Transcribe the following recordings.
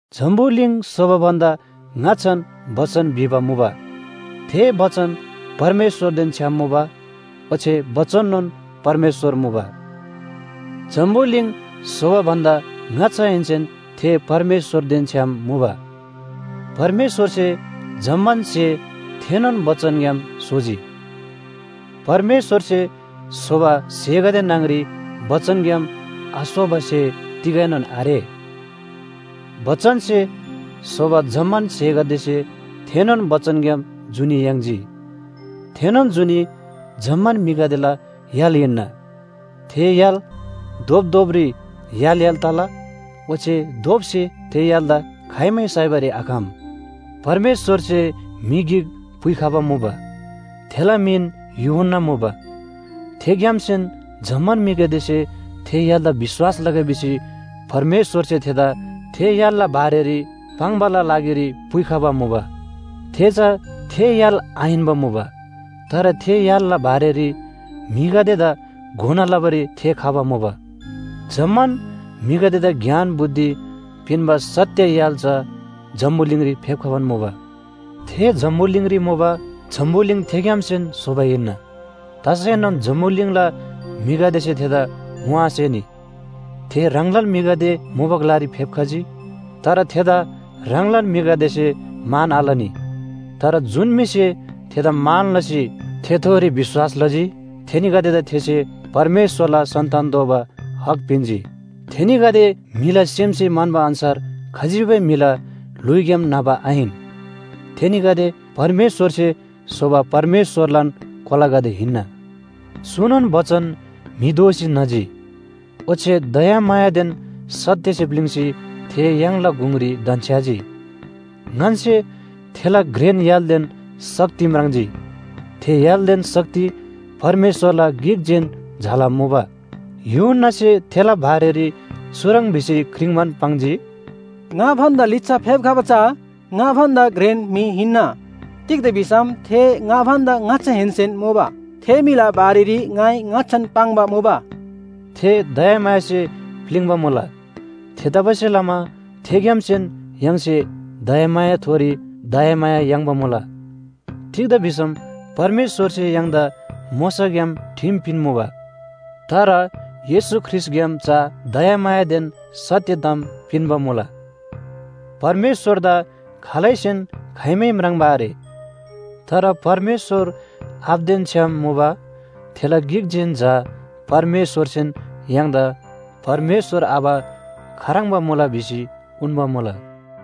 जम्‍बुलिङ स्‍होबा भन्‍दा ङाच्‍छान बचन भिबा मुबा, थे बचन परमेश्‍वरदेन छ्‌याम मुबा, ओच्‍छे बचननोन परमेश्‍वर मुबा। जम्‍बुलिङ स्‍होबा भन्‍दा ङाच्‍छाहेन्‍सेन थे परमेश्‍वरदेन छ्‌याम मुबा। परमेश्‍वरसे जम्‍मान स्‍हे थेनोन बचनग्‍याम स्‍होजी। परमेश्‍वरसे स्‍होबा स्‍हेगदे न्‍हङ‍री बचनग्‍याम आस्‍होबा स्‍हे तिगैनोन आरे। बचनसे स्‍होबा जम्‍मान स्‍हेगदेसे थेनोन बचनग्‍याम जुनी याङ्जी। थेनोन जुनी जम्‍मान म्‍हिगदेला य्‍हाल हिन्‍ना। थे य्‍हाल धोपधोपरी य्‍हाल य्‍हाल तला, ओच्‍छे धोपसे थे य्‍हालदा खाइमै साइबारी आखम। परमेश्‍वरसे म्‍हि गिक पुइखबा मुबा, थेला मिन यूहन्‍ना मुबा। थेग्‍यामसेन जम्‍मान म्‍हिगदेसे थे य्‍हालदा विश्‍वास लगै भिसी परमेश्‍वरसे थेदा थे य्‍हालला बारेरी पाङ्‌बाला लागिरी पुइखबा मुबा। थे चा थे य्‍हाल आहिन्‍बा मुबा। तर थे य्‍हालला बारेरी म्‍हिगदेदा घोना लबारी थे खबा मुबा। जम्‍मान म्‍हिगदेदा ज्ञान बुद्धि पिन्‍बा सत्‍य य्‍हाल चा जम्‍बुलिङरी फेप्‍खबान मुबा। थे जम्‍बुलिङरी मुबा, जम्‍बुलिङ थेग्‍यामसेन स्‍होबा हिन्‍ना। तसैनोन जम्‍बुलिङला म्‍हिगदेसे थेदा ङोआसेनी। थे ह्राङलान म्‍हिगदे मुबा ग्‍लारी फेप्‍खजी। तर थेदा ह्राङलान म्‍हिगदेसे मान आलनी। तर जुन म्‍हिसे थेदा मान लसी थेथोरी विश्‍वास लजी, थेनीगदेदा थेसे परमेश्‍वरला सन्‍तान दोबा हक पिन्‍जी। थेनीगदे म्‍हिला सेमसे म्‍हन्‍बा अन्‍छार खजिबै म्‍हिला ल्‍हुइग्‍याम न्‍हबा आहिन। थेनीगदे परमेश्‍वरसे स्‍होबा परमेश्‍वरलान कोलागदे हिन्‍ना। चुनोन बचन म्‍हि दोसी न्‍हजी, ओच्‍छे दयामायादेन सत्‍यसे प्‍लिङ्‌सी थे य्‍हाङला गुङरी धन्‍छ्‌याजी। ङन्‍से थेला घ्रेन य्‍हालदेन शक्ति म्राङ्जी, थे य्‍हालदेन शक्ति परमेश्‍वरला गिकजेन झाला मुबा। यूहन्‍नासे थेला बारेरी चुह्रङ् भिसी क्रिङ्बान पाङ्जी, “ङा भन्‍दा लिच्‍छा फेप्‍खबा चा ङा भन्‍दा घ्रेन म्‍हि हिन्‍ना। तिग्‍दा भिसम थे ङा भन्‍दा ङाच्‍छाहेन्‍सेन मुबा। थे म्‍हिला बारेरी ङाइ ङाच्‍छान पाङ्बा मुबा।” थे दयामायासे प्‍लिङ्बा मुला। थेतबासेलमा थेग्‍यामसेन य्‍हाङसे दयामायाथोरी दयामाया याङ्बा मुला। तिग्‍दा भिसम परमेश्‍वरसे य्‍हाङदा मोशाग्‍याम ठिम पिन्‍मुबा। तर येशू ख्रीष्‍टग्‍याम चा दयामायादेन सत्‍य ताम पिन्‍बा मुला। परमेश्‍वरदा खालैसेन खाइमै म्राङ्बा आरे। तर परमेश्‍वर आबादेन छ्‌याम मुबा थेला गिकजेन झा परमेश्‍वरसेन य्‍हाङदा परमेश्‍वर आबा खाह्रङ्बा मुला भिसी उन्‍बा मुला।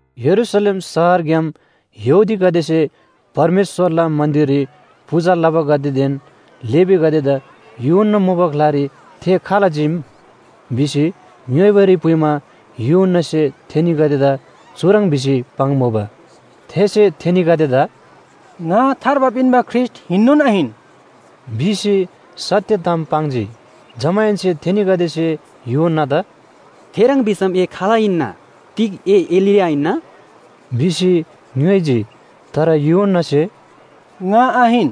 यरूशलेम शहरग्‍याम यहूदीगदेसे परमेश्‍वरला मन्‍दिररी पूजा लबागदेदेन लेवीगदेदा यूहन्‍ना मुबा ग्‍लारी थे खाल चीम? भिसी ङ्‌योइबारी पुइमा यूहन्‍नासे थेनीगदेदा चुह्रङ् भिसी पाङ्मुबा। थेसे थेनीगदेदा “ङा थार्बा पिन्‍बा ख्रीष्‍ट हिन्‍नोन आहिन” भिसी सत्‍य ताम पाङ्जी। जमाहेन्‍से थेनीगदेसे यूहन्‍नादा “थेह्रङ् भिसम ए खाल हिन्‍ना? तिग ए एलिया हिन्‍ना” भिसी ङ्‌योइजी। तर यूहन्‍नासे “ङा आहिन”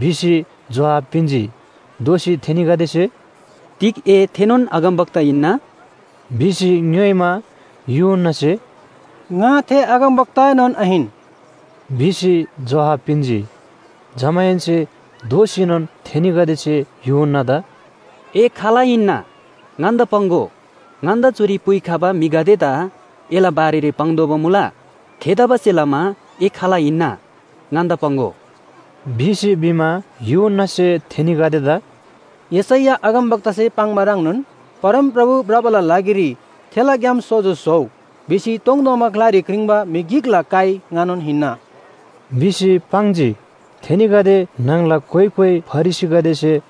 भिसी जोहाब पिन्‍जी। दोःसी थेनीगदेसे “तिग ए थेनोन अगमवक्ता हिन्‍ना?” भिसी ङ्‌योइमा, यूहन्‍नासे “ङा थे अगमवक्ताएनोन आहिन” भिसी जोहाब पिन्‍जी। जमाहेन्‍से दोःसीनोन थेनीगदेसे यूहन्‍नादा “ए खाल हिन्‍ना? ङन्‍दा पाङ्‍गो। ङन्‍दा चुरी पुइखबा म्‍हिगदेदा एला बारेरी पाङ्तोःबा मुला। थेतबासेलमा ए खाल हिन्‍ना? ङन्‍दा पाङ्‍गो” भिसी भिमा, यूहन्‍नासे थेनीगदेदा “यशैया अगमवक्तासे पाङ्बा ह्रङ्नोन ‘परमप्रभु भ्रबाला लागिरी थेला ग्‍याम सोजो स्‍होउ’ भिसी तोङतोङबा ग्‍लारी क्रिङ्बा म्‍हि गिकला काइ ङानोन हिन्‍ना” भिसी पाङ्जी। थेनीगदे न्‍हङला कोइ कोइ फरिसीगदेसे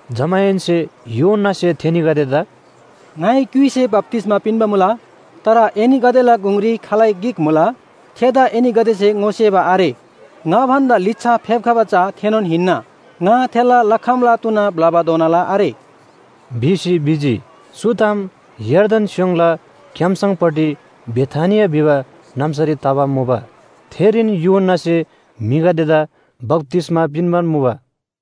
जमाहेन्‍से यूहन्‍नासे थेनीगदेदा “ङाइ क्‍युइसे बप्‍तिस्‍मा पिन्‍बा मुला, तर एनीगदेला गुङरी खालै गिक मुला थेदा एनीगदेसे ङोसेबा आरे। ङा भन्‍दा लिच्‍छा फेप्‍खबा चा थेनोन हिन्‍ना। ङा थेला लखमला तुना ब्‍लबाधोनाला आरे” भिसी भिजी। चु ताम यर्दन स्‍योङला क्‍याम्‍सङपट्टि बेथानिया भिबा नाम्‍सारी तबा मुबा, थेरीन यूहन्‍नासे म्‍हिगदेदा बप्‍तिस्‍मा पिन्‍बान मुबा।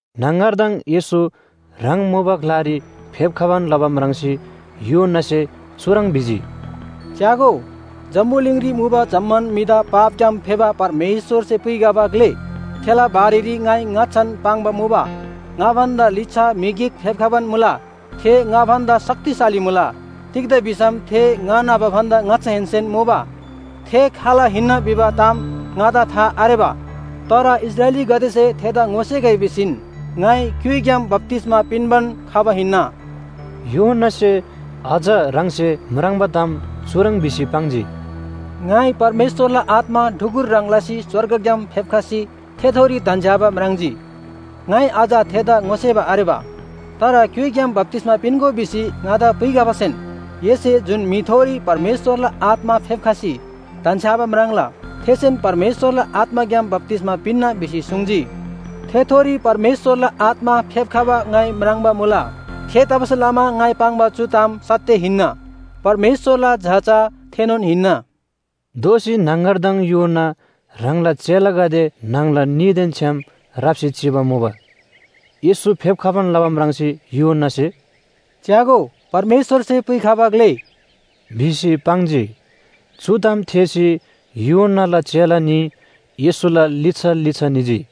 न्‍हङगरदङ येशू ह्राङ मुबा ग्‍लारी फेप्‍खबान लबा म्राङ्सी यूहन्‍नासे चुह्रङ् भिजी, “च्‍यागो, जम्‍बुलिङरी मुबा जम्‍मान म्‍हिदा पापग्‍याम फेबा परमेश्‍वरसे पुइखबा ग्‍ले! थेला बारेरी ङाइ ङाच्‍छान पाङ्बा मुबा, ‘ङा भन्‍दा लिच्‍छा म्‍हि गिक फेप्‍खबान मुला, थे ङा भन्‍दा शक्तिशाली मुला। तिग्‍दा भिसम थे ङा न्‍हबा भन्‍दा ङाच्‍छाहेन्‍सेन मुबा।’ थे खाल हिन्‍ना भिबा ताम ङादा था आरेबा, तर इस्राएलीगदेसे थेदा ङोसेगै भिसीन ङाइ क्‍युइग्‍याम बप्‍तिस्‍मा पिन्‍बान खबा हिन्‍ना।” यूहन्‍नासे अझ ह्राङसे म्राङ्बा ताम चुह्रङ् भिसी पाङ्जी, “ङाइ परमेश्‍वरला आत्‍मा ढुकुर ह्रङ् लसी स्‍वर्गग्‍याम फेप्‍खसी थेथोरी धन्‍छ्‌याबा म्राङ्जी। ङाइ अझ थेदा ङोसेबा आरेबा, तर क्‍युइग्‍याम बप्‍तिस्‍मा पिन्‍गो भिसी ङादा पुइखबासेन, ‘एसे जुन म्‍हिथोरी परमेश्‍वरला आत्‍मा फेप्‍खसी धन्‍छ्‌याबा म्राङ्ला, थेसेन परमेश्‍वरला आत्‍माग्‍याम बप्‍तिस्‍मा पिन्‍ना’ भिसी सुङ्जी। थेथोरी परमेश्‍वरला आत्‍मा फेप्‍खबा ङाइ म्राङ्बा मुला। थेतबासेलमा ङाइ पाङ्बा चु ताम सत्‍य हिन्‍ना, परमेश्‍वरला झा चा थेनोन हिन्‍ना।” दोःसी न्‍हङगरदङ यूहन्‍ना ह्राङला चेलागदे न्‍हङला न्‍हीदेन छ्‌याम राप्‍सी चिबा मुबा। येशू फेप्‍बान लबा म्राङ्सी यूहन्‍नासे, “च्‍यागो, परमेश्‍वरसे पुइखबा ग्‍ले!” भिसी पाङ्जी। चु ताम थेःसी यूहन्‍नाला चेला न्‍ही येशूला लिच्‍छा लिच्‍छा निजी।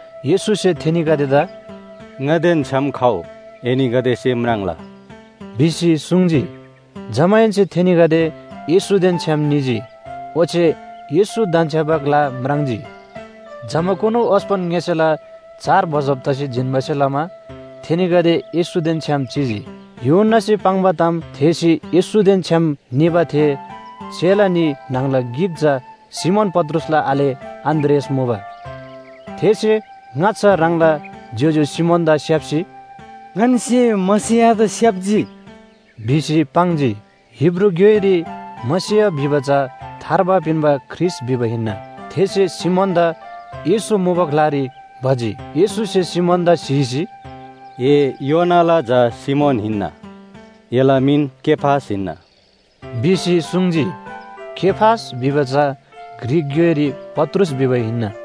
येशूसे थेनीगदेदा “ङादेन छ्‌याम खउ, एनीगदेसे म्राङ्ला” भिसी सुङ्जी। जमाहेन्‍से थेनीगदे येशूदेन छ्‌याम निजी, ओच्‍छे येशू धन्‍छ्‌याबा ग्‍ला म्राङ्जी। जमाकुनु ओस्‍पन ङ्‍यसेला चार बजब तसी जिन्‍बासे लमा थेनीगदे येशूदेन छ्‌याम चिजी। यूहन्‍नासे पाङ्बा ताम थेःसी येशूदेन छ्‌याम निबा थे चेला न्‍ही न्‍हङला गिक चा सिमोन पत्रुसला आले अन्‍द्रियास मुबा। थेसे ङाच्‍छा ह्राङला ज्‍योज्‍यो सिमोनदा स्‍याप्‍सी, “ङन्‍से मसीहदा स्‍याप्‍जी,” भिसी पाङ्जी। हिब्रू ग्‍योइरी “मसीह” भिबा चा “थार्बा पिन्‍बा ख्रीष्‍ट” भिबा हिन्‍ना। थेसे सिमोनदा येशू मुबा ग्‍लारी भजी। येशूसे सिमोनदा स्‍हीसी, “ए योनाला झा सिमोन हिन्‍ना, एला मिन केफास हिन्‍ना” भिसी सुङ्जी। केफास भिबा चा ग्रीक ग्‍योइरी पत्रुस भिबा हिन्‍ना।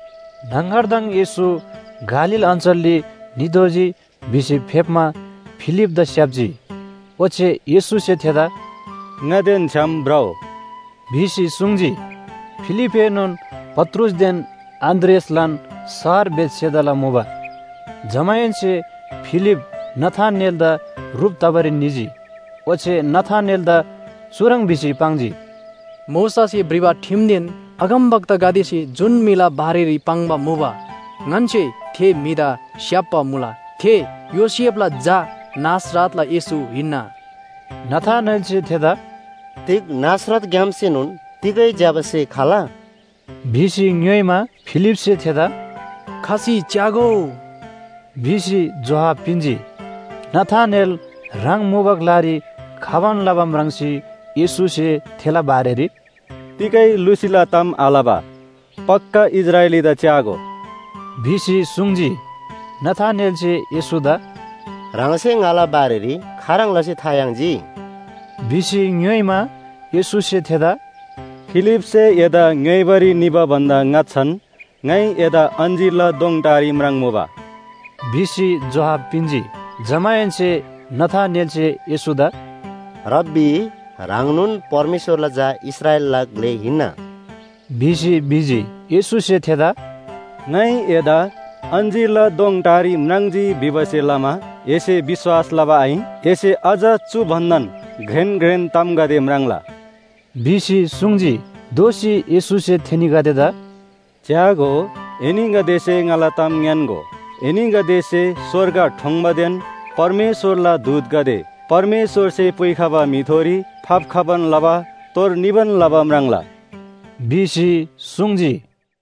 न्‍हङगरदङ येशू गालील अञ्‍चलरी नितोःजी भिसी फेप्‍मा फिलिपदा स्‍याप्‍जी। ओच्‍छे येशूसे थेदा “ङादेन छ्‌याम भ्रउ” भिसी सुङ्जी। फिलिपएनोन पत्रुसदेन अन्‍द्रियासलान शहर बेथसेदाला मुबा। जमाहेन्‍से फिलिप नथानेलदा ह्रुप तबारी निजी। ओच्‍छे नथानेलदा चुह्रङ् भिसी पाङ्जी, “मोशासे भ्रिबा ठिमदेन अगमवक्तागदेसे जुन म्‍हिला बारेरी पाङ्बा मुबा, ङन्‍से थे म्‍हिदा स्‍याप्‍बा मुला। थे योसेफला झा नासरतला येशू हिन्‍ना।” नथानेलसे थेदा “तिग नासरतग्‍यामसेनोन तिगै ज्‍यबा स्‍हे खला?” भिसी ङ्‌योइमा, फिलिपसे थेदा “खसी च्‍यागो” भिसी जोहाब पिन्‍जी। नथानेल ह्राङ मुबा ग्‍लारी खबान लबा म्राङ्सी येशूसे थेला बारेरी “तिगै लुसीला ताम आलबा पक्‍का इस्राएलीदा च्‍यागो” भिसी सुङ्जी। नथानेलसे येशूदा “ह्राङसे ङाला बारेरी खाह्रङ् लसी था याङ्जी?” भिसी ङ्‌योइमा, येशूसे थेदा “फिलिपसे एदा ङ्‌योइबारी निबा भन्‍दा ङाच्‍छान ङाइ एदा अञ्‍जीरला दोङ टारी म्राङ्मुबा” भिसी जोहाब पिन्‍जी। जमाहेन्‍से नथानेलसे येशूदा “रब्‍बी, ह्राङनोन परमेश्‍वरला झा इस्राएलला ग्‍ले हिन्‍ना” भिसी भिजी। येशूसे थेदा “ङाइ एदा अञ्‍जीरला दोङ टारी म्राङ्जी भिबासे लमा एसे विश्‍वास लबा आहिन? एसे अझ चु भन्‍दान घ्रेन घ्रेन तामगदे म्राङ्ला” भिसी सुङ्जी। दोःसी येशूसे थेनीगदेदा “च्‍यागो, एनीगदेसे ङाला ताम ङ्‌यान्‍गो, एनीगदेसे स्‍वर्ग ठोङ्बादेन परमेश्‍वरला दूतगदे परमेश्‍वरसे पुइखबा म्‍हिथोरी फाप्‍खबान लबा तोर निबान लबा म्राङ्ला” भिसी सुङ्जी।